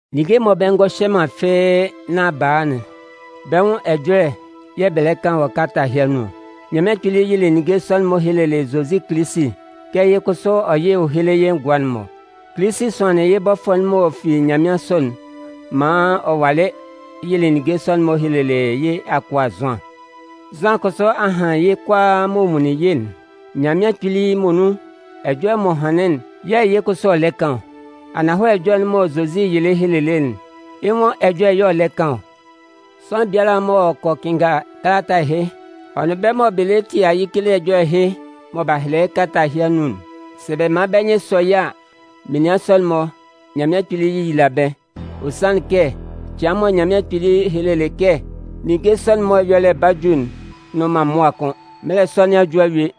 Ninnge mɔ bɛ ngɔ hyɛ man fɩ́ɩ́ nán b'a a'n, bɛ́ nwʋn ɛjɔlɛ yɛ̂ bɛ lɛ kan wɔ kalata ɛhɩ anun ɔ. Nyanmɩan Kpili yɩlɩ ninnge sɔ'n-mɔ helelɩ Zozi Kilisi kɛ yɩ́ kʋsʋ ɔ yɩ́ héle yɩ́ ngʋa'n-mɔ. Kilisi sʋanlɩn yɩ́ bɔfʋɛ'n m'ɔ fi nyanmɩansʋ'n maan ɔ walɩ yɩlɩ ninnge sɔ'n-mɔ helelɩ yɩ́ akʋa Zʋan. Zʋan kʋsʋ a han yɩ́ kʋalaa m'ɔ nwunlin yɩ́'n. Nyanmɩan Kpili muonun ɛjɔlɛ m'ɔ hanlɩn'n yɛ̂ yɩ́ kʋsʋ ɔ lɛ kan ɔ. Ananhɔlɛ ɛjɔlɛ'n mɔ Zozi yɩlɩ helelɩ'n, yɩ́ nwʋn ɛjɔlɛ y'ɔ lɛ kan ɔ. Sʋanlan biala m'ɔ kɔ kɩnnga kalata ɛhɩ, ɔ nʋn bɛ́ mɔ bɛ lɛ tie ayɩkele ɛjɔlɛ ɛhɩ mɔ b'a hɛlɛ yɩ́ kalata ɛhɩ anun'n, sɛ bɛ man bɛ́ nyɩn sɔ yɩ́ a, menian sɔ'n-mɔ, Nyanmɩan Kpili yéyila bɛ́. Ɔ sanlɩn kɛ cɩan'n mɔ Nyanmɩan Kpili helelɩ kɛ ninnge sɔ'n-mɔ ɛyɔlɛ 'ba ju'n nnʋn man mʋa kʋ́n. Mɛlɛ sɔ nɩn a ju a yue.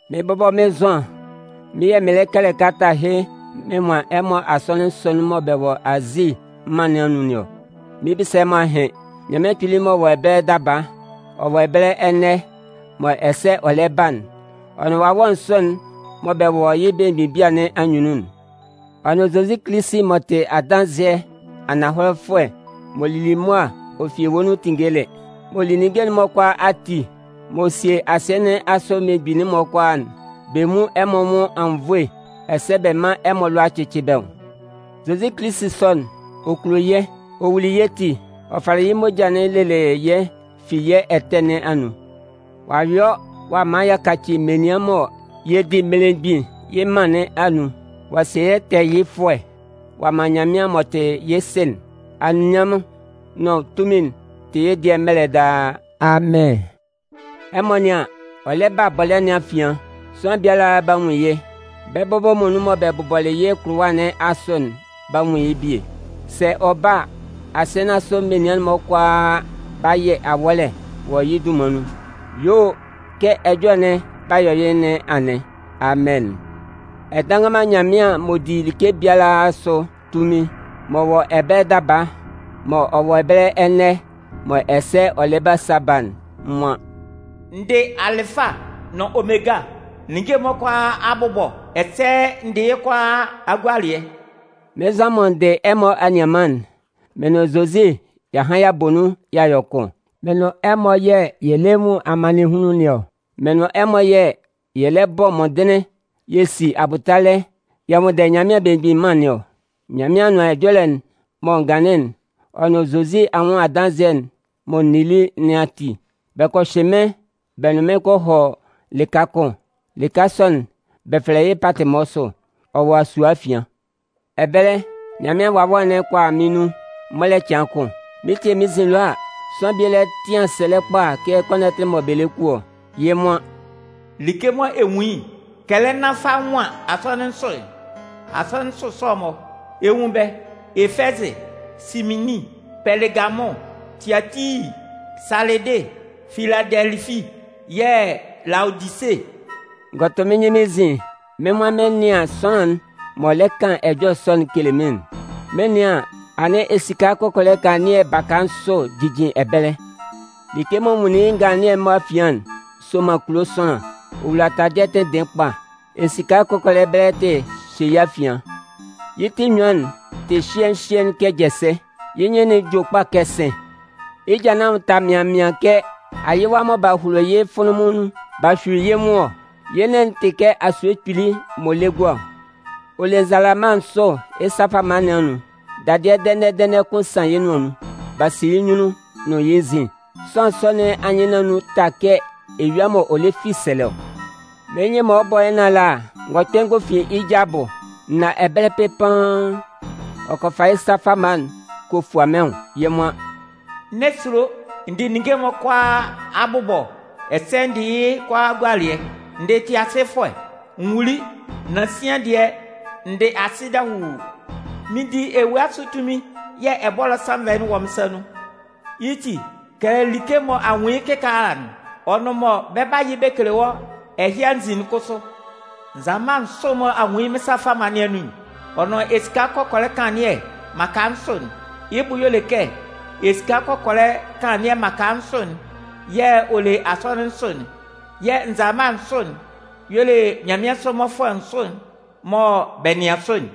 Mɩ́n bɔbɔ mɩ́n Zʋan, mɩ́n yɛ̂ mɩɩn kɛlɛ kalata ɛhɩ mɩn nwan ɛmɔ asɔnɩn nsʋ'n mɔ bɛ wɔ Azi mân nɩn anun nɩn ɔ. Mɩn 'bisa ɛmɔ ahɩn. Nyanmɩan Kpili m'ɔ wɔ ɛbɛlɛ daba, ɔ wɔ ɛbɛlɛ ɛnɛ mɔ ɛsɛ ɔ lɛ ba'n, ɔ nʋn wawɛ nsʋ'n mɔ bɛ wɔ yɩ́ belemgbin bia nɩn anyunnun'n, ɔ nʋn Zozi Kilisi m'ɔ tɩ adanzɩɛ ananhɔlɛfʋɛ m'ɔ lili mʋa ɔ fi ewue nun tinngeli, m'ɔ li ninnge'n-mɔ kʋalaatin ati, m'ɔ sie asɩɛ nɩn asʋ mmelemgbin'n-mɔ kʋalaa'n, bɛ nwún ɛmɔ anwʋn anwunnvoe ɛsɛ bɛ mán ɛmɔ alʋa cɩ́cɩ bɛ́ nwʋn. Zozi Kilisi sɔ'n, ɔ kulo yɛ́. Ɔ wuli yɛ́ ti, ɔ falɩ yɩ́ moja'n lelɩ yɛ́ fi yɛ́ ɛtɛ nɩn anun. Ɔ'a yɔ ɔ'a man y'a kaci menian mɔ yɛ di mmelemgbin yɩ́ mân nɩn anun. Ɔ'a sie yɛ́ tɛɛyɩfʋɛ ɔ'a man Nyanmɩan m'ɔ tɩ yɩ́ Sɩ'n. Anunminnyanmʋn'n nʋn tunmin'n tɩ yɩ́ dɩɛ mɛlɛ daa! Amɩn. Ɛmɔ nɩ́an, ɔ lɛ ba bɔlɛ́ nɩn afian. Sʋanlan biala 'ba nwun yɩ́. Bɛ́ bɔbɔ muonun mɔ bɛ bʋbɔlɩ yɩ́ kʋlʋwa nɩn asʋ'n 'ba nwun yɩ́ bie. Sɛ ɔ ba a, asɩɛ nɩn asʋ menian'n-mɔ kʋalaa 'ba yɩ awɔ́lɛ wɔ yɩ́ dunman nun. Yuo o, kɛ ɛjɔlɛ'n 'ba yɔ yɩ́ nɩn anɩn. Amɩn. Ɛdannganman Nyanmɩan m'ɔ di like biala asʋ tunmin, m'ɔ wɔ ɛbɛlɛ daba, m'ɔ wɔ ɛbɛlɛ ɛnɛ mɔ ɛsɛ ɔ lɛ ba sa ba'n nwan: “N dɩ Alɩfa nʋn Omega, ninnge'n-mɔ kʋalaa Abʋbɔ ɛsɛ n dɩ yɩ́ kʋalaa Agualɩɛ”. Mɩ́n Zʋan mɔ n dɩ ɛmɔ anianman'n, mɩn nʋn Zozi y'a han y'a bɔ nun y'a yɔ kʋn. Mɩ́n nʋn ɛmɔ yɛ̂ yɛ lɛ nwun amannɩnhunlun nɩn ɔ. Mɩ́n nʋn ɛmɔ yɛ̂ yɛ lɛ bɔ mɔndɩnlɩn yɛ si abʋtalɛ yɛ nwʋnndɛ Nyanmɩan Belemgbin Mân nɩn ɔ. Nyanmɩan Anʋan Ɛjɔlɛ'n mɔ n ganlɩn'n, ɔ nʋn Zozi anwʋn adanzɩɛ'n mɔ n nili nɩn ati, bɛ kɔ hyɩ mɩ́n bɛ nʋn mɩn kɔ hɔ lɩka kʋn. Lɩka sɔ'n bɛ fɛlɛ yɩ́ Patɩmɔsʋ. Ɔ wɔ asue afian. Ɛbɛlɛ, Nyanmɩan Wawɛ'n kɔ a mɩ́n nun mɔlɛ cɩan kʋn. Mɩn tie mɩ́n nzin ɛlɔ a, sʋanlan bie lɛ tɩan sɛlɛ kpa kɛ kɔnɔtɩ mɔ bɛ lɛ ku ɔ. Yɩ́ nwan: “Like mɔ ɛ nwun yɩ́'n, kɛlɛ nán fa nwan asɔnɩn nsʋ'n. Asɔnɩn nsʋ sɔ'n-mɔ, ɛ 'nwun bɛ́: Efɛzɩ, Sɩminnin, Pɛlɩgamʋn, Tiatii, Salɩdɩ, Filadɛlɩfi, yɛ̂ Laodise.” N gɔ tʋ mɩ́n nyɩn mɩ́n nzin mɩ́n nwan mɩn 'nɩan sʋanlan'n m'ɔ lɛ kan ɛjɔlɛ sɔ'n kele mɩ́n'n. Mɩn 'nɩan an, anɩn esika kɔkɔlɛ kanlannɩɛ baka nsʋ jijin ɛbɛlɛ. Like mɔ n nwunlin yɩ́ nganlannɩɛ'n mɔ afian'n sɔman kulo sʋanlan. Ɔ wula taladɩɛ tɩnndɩɩn kpa. Esika kɔkɔlɛ bɛlɛtɩ hyɩ yɩ́ afian. Yɩ́ ti enyuan'n tɩ hyɩɛɩn hyɩɛɩn kɛ jɛsɛ. Yɩ́ nyɩn'n jue kpa kɛ sɩ̂n. Yɩ́ ja nɩn anwʋn ta mɩaɩn mɩaɩn kɛ ayɩwa mɔ b'a holo yɩ́ fʋnlʋnmʋn nun b'a hyui yɩ́ nwʋn ɔ. Yɩ́ nɩn'n tɩ kɛ asue kpili m'ɔ lɛ gua ɔ. Ɔ le nzalama nsʋ yɩ́ sa fama nɩn anun. Dadɩɛ dɛnɛ-dɛnɛ kʋn san yɩ́ nʋan nun. B'a si yɩ́ nyunnun nʋn yɩ́ nzin. Sʋanlan sɔ nɩn anyɩn nɩn anun ta kɛ eyua mɔ ɔ lɛ fi sɛlɛ ɔ. Mɩ́n nyɩn mɔ ɔ 'bɔ yɩ́ nɩn ala n gɔ kpɛ n gɔ fin yɩ́ ja abʋ, n na ɛbɛlɛ pɩpaan. Ɔ kɔ fa yɩ́ sa fama'n ɔ kɔ fua mɩ́n nwʋn. Yɩ́ nwan: “N'ɛ sulo! N dɩ ninnge'n-mɔ kʋalaa Abʋbɔ, ɛsɛ n dɩ yɩ́ kʋalaa Agualɩɛ. N dɩ tɩasɩfʋɛ. N wuli, nan sian dɩɛ, n dɩ asɩ dahuu. Mɩn di ewue asʋ tunmin yɛ̂ ɛbɔlɔ sannvɛ'n wɔ mɩ́n sa nun. Yɩ́ ti, kɛlɛ like mɔ a nwun yɩ́ kɩkaala'n, ɔ nʋn mɔ bɛ 'ba yɩ bɛ kele wɔ́ ɛhɩ anzin'n kʋsʋ. Nzalama nsʋ'n mɔ a nwun yɩ́ mɩ́n sa fama nɩn anun'n, ɔ nʋn esika kɔkɔlɛ kanlannɩɛ mmaka nsʋ'n, yɩ́ bʋ y'ɔ le kɛ esika kɔkɔlɛ kanlannɩɛ mmaka nsʋ'n yɛ̂ ɔ le asɔnɩn nsʋ'n, yɛ̂ nzalama nsʋ'n, y'ɔ le nyanmɩansʋ mmɔfʋɛ nsʋ'n mɔ bɛ nɩan sʋ'n.”